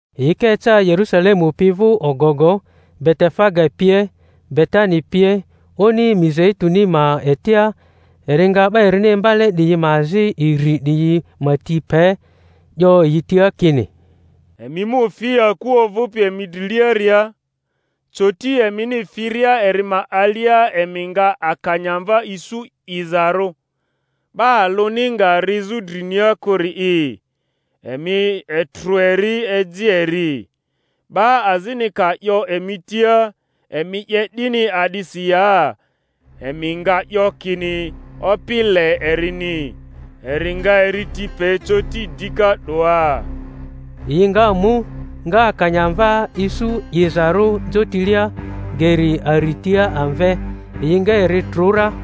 Yi ka eca Yerusalemu pi vᴜ ogogo, Betefage pie, Betani pie, oni Mizeituni ma etia, eri nga 'ba erini imbale 'diyi ma azi iri 'diyi ma ti pe. 'yo yi tia kini, Emi mu fi aku ovᴜpi emi driliaria; coti emini firia eri ma alia emi nga akanyamva isu 'izarᴜ, 'ba alᴜni nga rizᴜ drinia kᴜri'i; emi etrᴜ eri, eji eri. 'Ba azini ka 'yo emi tia, Emi 'ye 'dini a'disi ya? emi nga 'yo kini, Opi le erini, eri nga eri ti pe coti dika 'doa. Yi nga mu, nga akanyamva isu 'izarᴜ jotilia, geri aritia amve; yi nga eri trᴜ ra.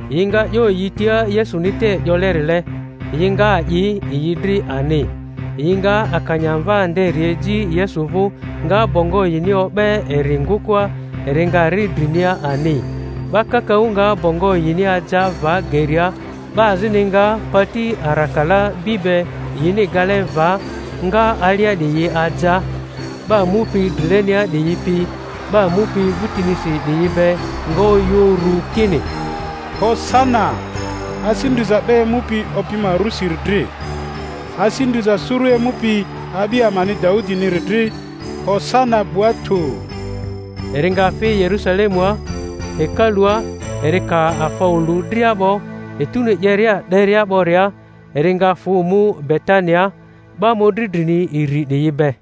Yi nga 'yo yi tia Yesuni te 'yolerile; yi nga a'i yi dri ani. Yi nga akanyamva nderi eji Yesu vᴜ, nga bongo yini o'be eri ngᴜkᴜa, eri nga ri drinia ani. 'Ba kakaᴜ nga bongo yini aja va geria; 'ba azini nga pati arakala bi be yini gale va nga alia 'diyi aja. 'Ba mupi drilenia 'diyi pi 'ba mupi vᴜtinisi 'diyi be nga oyᴜ uru kini, Hosana! Asi ndriza 'ba emupi Opi ma rᴜsiri dri! Asi ndriza suru emupi a'bi amani Daudiniri dri! Hosana 'bua tᴜ! Eri nga fi Yerusalemua hekalᴜa; eri ka afa olu dria 'bo, etuni 'yeria 'deria 'boria eri nga fᴜ mu Betania, 'ba mᴜdri drini iri 'diyi be.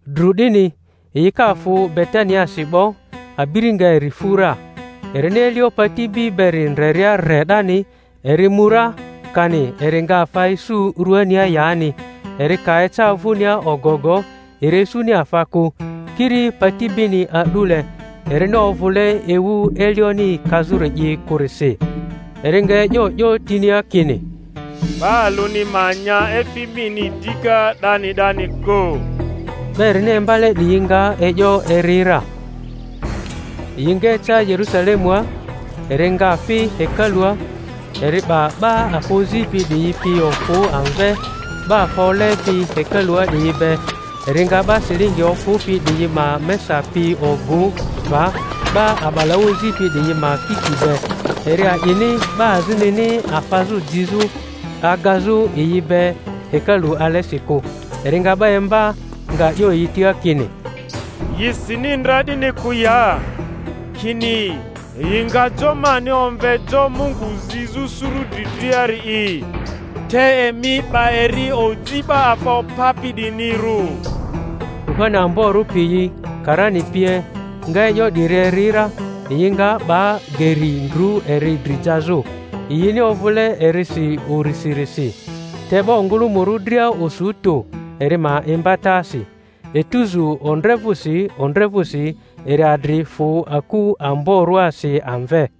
Dru 'dini, yi ka fᴜ Betaniasi 'bo, abiri nga eri fu ra. Erini elio pati bi beri ndreria re 'dani, eri mu ra, kani eri nga afa isu ruania yani. Eri ka eca vᴜnia ogogo, eri isuni afa kᴜ, kiri pati bini a'dule, erini ovᴜle ewu elioni kazᴜri'i kᴜrisi. Eri nga e'yo 'yo tinia kini, 'Ba alᴜni ma nya efi mini dika 'dani 'dani kᴜ. 'Ba erini imbale 'diyi nga e'yo eri ra. Yi nga eca Yerusalemua. Eri nga fi hekalua, eri 'ba 'ba afa ozipi 'diyi pi ofᴜ amve, 'ba afa olepi hekalua 'diyi be, eri nga 'ba silingi ofᴜpi 'diyi ma mesa pi ogᴜ va, 'ba a'balaᴜ ozipi 'diyi ma kiti be; eri a'ini 'ba azinini afazᴜ jizᴜ agazᴜ yi be hekalu alesi kᴜ. Eri nga 'ba imba, nga 'yo yi tia kini, Yi sini ndra 'dini kᴜ ya, kini, Yi nga jo mani omve jo Mungu zizᴜ suru dri driari'i? Te emi 'ba eri oji 'ba afa opapi 'diyinirᴜ. Kuhani amborᴜ piyi karani pie nga e'yo 'diri eri ra, yi nga 'ba geri ndru eri dri jazᴜ; yini ovᴜle erisi urisirisi, te 'ba ongᴜlᴜmᴜrᴜ dria osu tᴜ eri ma imbatasi. Etuzu ondre vᴜsi ondre vᴜsi eri adri fᴜ aku amborᴜasi amve.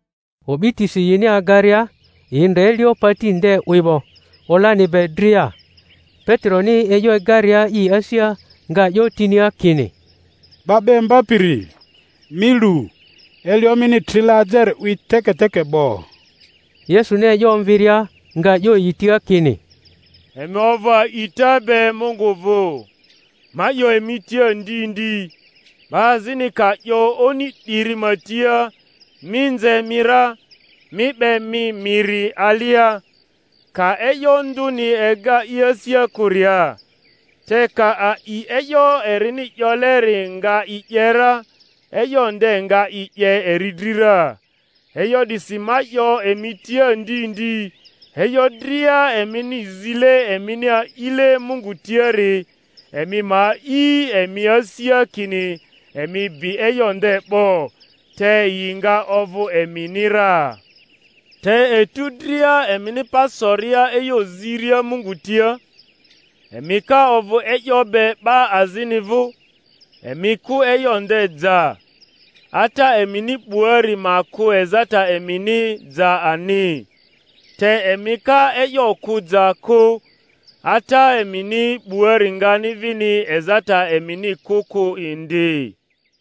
O'bitisi yini agaria, yi ndre elio pati nde 'wi 'bo, olani be dria. Peteroni e'yo egaria i asia nga 'yo tinia kini, 'Ba 'ba Imbapiri, mi lu! Elio mini trile ajeri 'wi teketeke 'bo. Yesuni e'yo omviria, nga 'yo yi tia kini, Emi ovᴜ ai'ta be Mungu vᴜ. Ma 'yo emi tia ndi ndi, 'ba azini ka 'yo oni 'diri ma tia, Mi nze mi ra, mi 'be mi miri alia; ka e'yo ndᴜni ega i asia kᴜria, te ka a'i e'yo erini 'yoleri nga i 'ye ra, e'yo nde nga i 'ye eri dri ra. E'yo 'disi ma 'yo emi tia ndi ndi, e'yo dria emini zile emini a'ile Mungu tiari, emi ma a'i emi asia kini emi bi e'yo nde 'bo, te yi nga ovᴜ emini ra. Te etu dria emini pa soria e'yo ziria Mungu tia, emi ka ovᴜ e'yo be 'ba azini vᴜ, emi kᴜ e'yo nde ja; Ata emini 'buari ma kᴜ ezata emini ja ani. Te emi ka e'yo kᴜ ja kᴜ, Ata emini 'buari ngani vini ezata emini kᴜ kᴜ indi.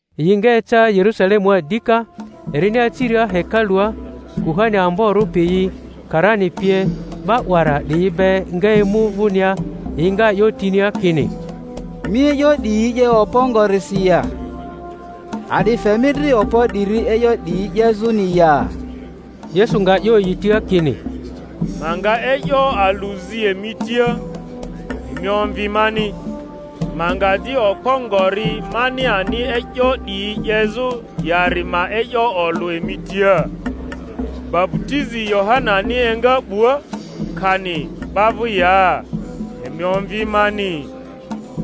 Yi nga eca Yerusalemua dika. Erini aciria hekalua, kuhani amborᴜ piyi karani pie, 'ba 'wara 'diyi be nga emu vᴜnia, yi nga 'yo tinia kini, Mi e'yo 'diyi 'ye okpo ngorisi ya? A'di fe mi dri okpo 'diri e'yo 'diyi 'yezᴜni ya? Yesu nga 'yo yi tia kini, Ma nga e'yo alᴜ zi emi tia; emi omvi mani, ma nga di okpo ngori mani ani e'yo 'diyi 'yezᴜ yari ma e'yo olᴜ emi tia. Baputizi Yohanani enga 'bua, kani 'ba vᴜ ya? Emi omvi mani.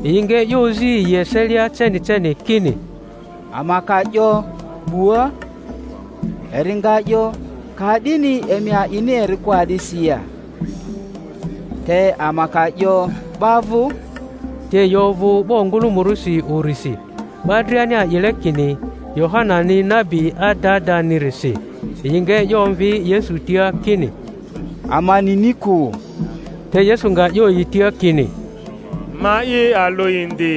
Yi nga e'yo ozi yi eselia ceni ceni, kini, Ama ka 'yo, 'Bua, eri nga 'yo, Ka'dini emi a'ini eri kᴜ a'disi ya? Te ama ka 'yo, 'Ba vᴜ, —te yi ovᴜ 'ba ongᴜlᴜmᴜrᴜsi urisi, 'ba driani a'ile kini Yohanani nabi adadanirisi. Yi nga e'yo omvi Yesu tia kini, Ama nini kᴜ. Te Yesu nga 'yo yi tia kini, Ma'i alᴜ indi,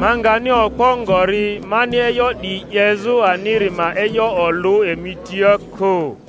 ma ngani okpo ngori mani e'yo 'diyi 'yezᴜ aniri ma e'yo olᴜ emi tia kᴜ.